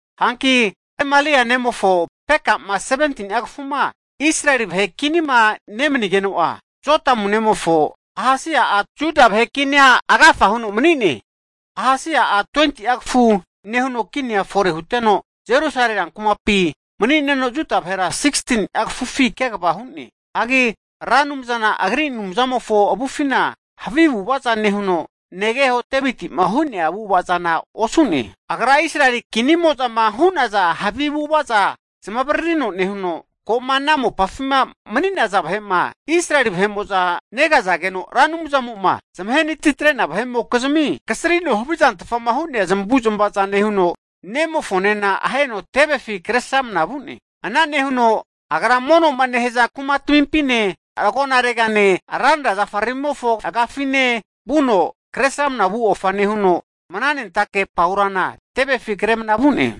Hanki Remalia nemofo Peka'ma 17ni'a kafuma Israeli vahe kinima nemani'geno'a, Jotamu nemofo Ahasi'a Juda vahe kinia agafa huno mani'ne. Ahasi'a 20'a kafu nehuno kinia fore huteno, Jerusalemi rankumapi mani'neno Juda vahera 16ni'a kafufi kegava hu'ne. Hagi Ra Anumzana agri Anumzamofo avufina havi avu'avaza nehuno, negeho Deviti'ma hu'nea avu'ava zana osu'ne. Agra Israeli kinimoza'ma hu'naza havi avu'avaza zamavaririno nehuno, ko'ma ana mopafima mani'naza vahe'ma, Israeli negazageno Ra Anumzamo'ma zamahe natitre'nea vahe'mokizmi kasrino havizantfa hu'nea zamavu'zmavaza nehuno, ne'mofonena aheno tevefi kresramna vu'ne. Ana nehuno agra mono'ma nehaza kumatmimpine, agonaregane ranra zafaramimofo agafine vuno, Kresramana vu ofa nehuno mnanentake paurana tevefi kre mna vu'ne.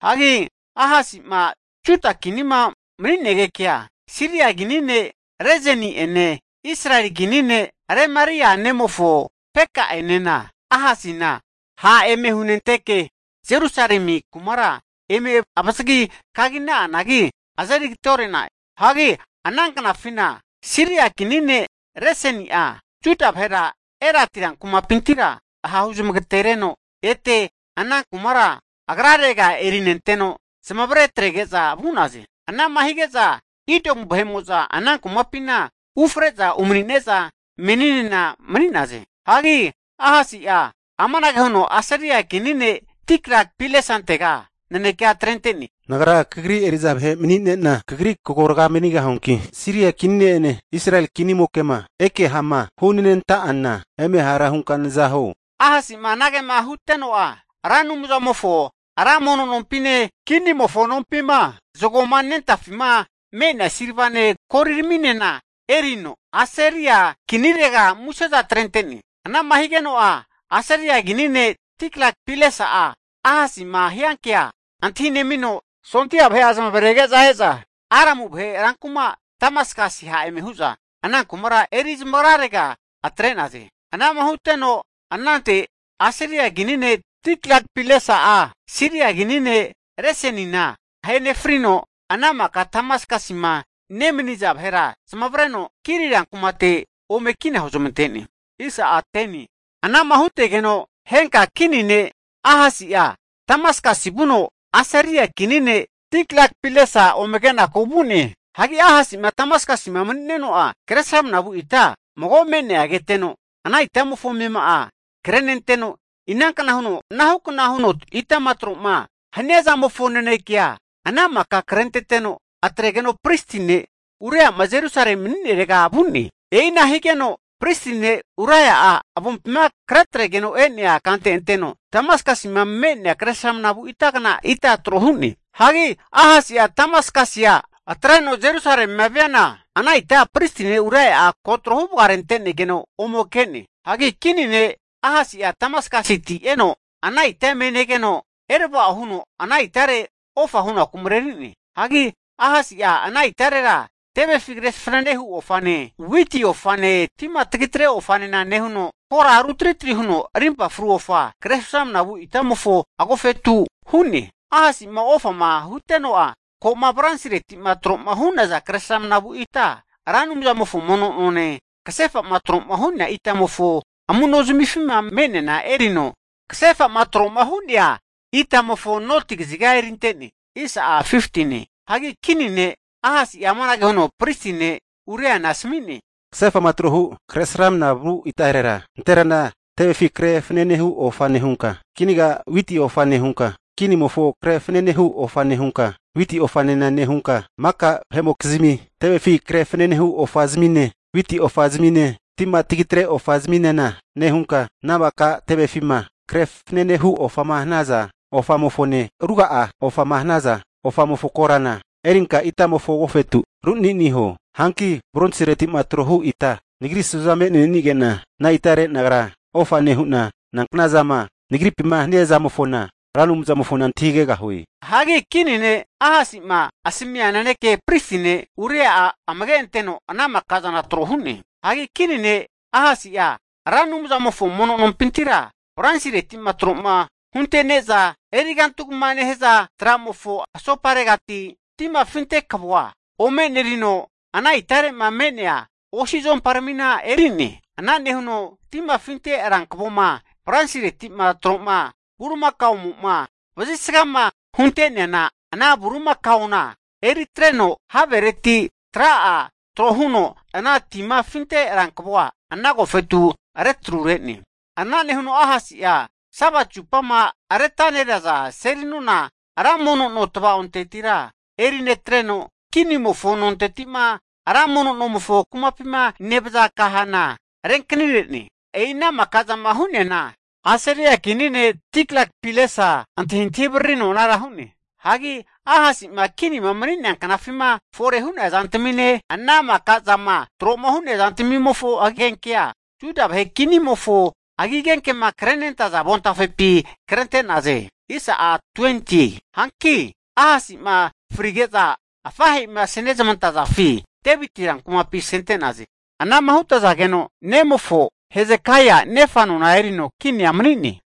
Hagi Ahasi'ma Juda kinima mani'negekea, Siria kini ne' Rezini'ene Israeli kini ne' Remalia nemofo Peka'enena Ahasina ha' eme hunenteke Jerusalemi kumara eme avazagi kagi'na'anagi azeri agateore'na'e. Hagi ana knafina Siria kini ne' Resini'a Juda vahera Elati rankumapintira hahuzamagatereno ete ana kumara agrarega erinenteno, zamavare atrege'za vu'naze. Anama hige'za Idomu vahe'mo'za ana kumapina ufre'za umani'ne'za meni'nena mani'naze. Hagi Ahasi'a amanage huno Asiria kini ne' Tiglat-Pilesantega nanekea atrente'ne. Nagra kagri eri'za vahe mani'nena kagri kagorga manigahuanki, Siria kini ne'ene, Israeli kinimoke'ma eke ha'ma hunenanta'ana eme hara hunka naza huo. Ahasi'ma anagema huteno'a, Ra Anumzamofo ra mono nompine, kinimofo nompima zagoma nentafima me'nea silvane goliraminena erino, Asiria kinirega museza atrente'ne. Anama higeno'a Asiria kini ne' Tiglat-Pilesa'a Ahasi'ma hiankea antahinemino, sondia vahe'a zamavarege'za e'za Aramu vahe rankuma Damaskasi ha' eme hu'za ana kumara eri zamagrarega atre'naze. Anama huteno anante Asiria kini ne' Tiglat-Pilesa'a Siria kini ne' Resinina ahe nefrino, ana maka Damaskasima nemaniza vahera zamavareno Kiri rankumate ome kina huzmante'ne. Anama hutegeno henka kini ne' Ahasi'a Damaskasi vuno Asiria kini ne' Tiglat-Pilesa ome kenaku vu'ne. Hagi Ahasi'ma Damaskasima mani'neno'a kresramna vu ita mago me'nea keteno, ana itamofo amema'a krenenteno, inankna huno anahukna itama tro'ma hania zamofo naneke'a ana maka krenteteno, atregeno pristi ne' Uria'ma Jerusalema mani'nerega vu'ne. E'ina higeno pristi ne' Uria'a avompima kretregeno e'nea kante anteno Damaskasima me'nea kresramnavu itagna ita tro hu'ne. Hagi Ahasi'a Damaskasia atreno Jerusalemia viana ana ita pristi ne' Uria'a ko tro huvagarente'nego ome ke'ne. Hagi kini ne' Ahasi'a Damaskasiti eno, ana ita eme negeno erava'o huno, ana itare ofa hunaku mareri'ne. Hagi Ahasi'a ana itarera tevefi kre fanane hu ofane, witi ofane, tima tagi tre ofanena nehuno, kora rutritri huno rimpa fru ofa kresramana vu itamofo agofetu hu'ne. Ahasi'ma ofama huteno'a, ko'ma bronsiretima tro'ma hu'naza kresramna vu ita, Ra Anumzamofo mono none, kasefa'ma tro'ma hu'nea itamofo amu'nozanifima me'neana erino kasefa'ma tro'ma hu'nea itamofo noti kaziga erinte'ne. Hagi kini ne' Ahasi'a amanage huno pristi ne' Uriana asmi'ne, kasefa'ma trohu kresramna vu itarera, nanterana tevefi kre fanane hu ofa nehunka, kinaga witi ofa nehunka, kinimofo kre fanane hu ofa nehunka, witi ofa'anena nehunka, maka vahe'mokizmi tevefi kre fanane hu ofazamine witi ofazamine tima tagitre ofazaminena nehunka, ana maka tevefima kre fananehu ofama hanaza ofamofone ruga'a ofama hanaza ofamofo korana erinka itamofo agofetu runi'ni huo. Hianagi bronsireti'ma trohu ita, nagri su'za me'nenige'na ana itare nagra ofa nehu'na, nanknazama nagripima hania zamofona Ra Anumzamofona antahigegahue. Hagi kini ne' Ahasi'ma asamia nanekea pristi ne' Uria'a amage anteno ana maka'zana tro hu'ne. Hagi kini ne' Ahasi'a Ra Anumzamofo mono nompintira bronsireti'ma tro huntene'za erigantugmama nehaza tra'mofo asoparegati timafinte kavoa ome enerino, ana itare'ma me'nea osi zuomparamina eri'ne. Ana nehuno timafinte rankavoma, bronsireti'ma trohu bulimakaomo'ma vazisgama hunte'neana ana bulimakaona eritreno havereti tra'a trohuno ana timafinte rankavoa ana agofetu retrure'ne. Ana nehuno Ahasi'a Sabati zupama retaneraza seli nona ra mono no tvaontetira erinetreno, kinimofo nonteti'ma ra mono nomofo kumapima nevaza kahana renkanire'ne. E'ina maka'zama hu'neana, Asiria kini ne' Tiglat-Pilesa antahintahi avaririno anara hu'ne. Hagi Ahasi'ma kinima mani'nea knafima fore hu'nea zamtamine, ana maka zama tro'ma hu'nea zantamimofo agenkea, Juda vahe kinimofo agigenkema krenentaza avontafepi krente'naze. Hanki Ahasi'ma frige'za afahe'ima asenezmantazafi, Deviti rankumapi asente'naze. Anama hutazageno nemofo Hezekaia nefa nona erino kinia mani'ne.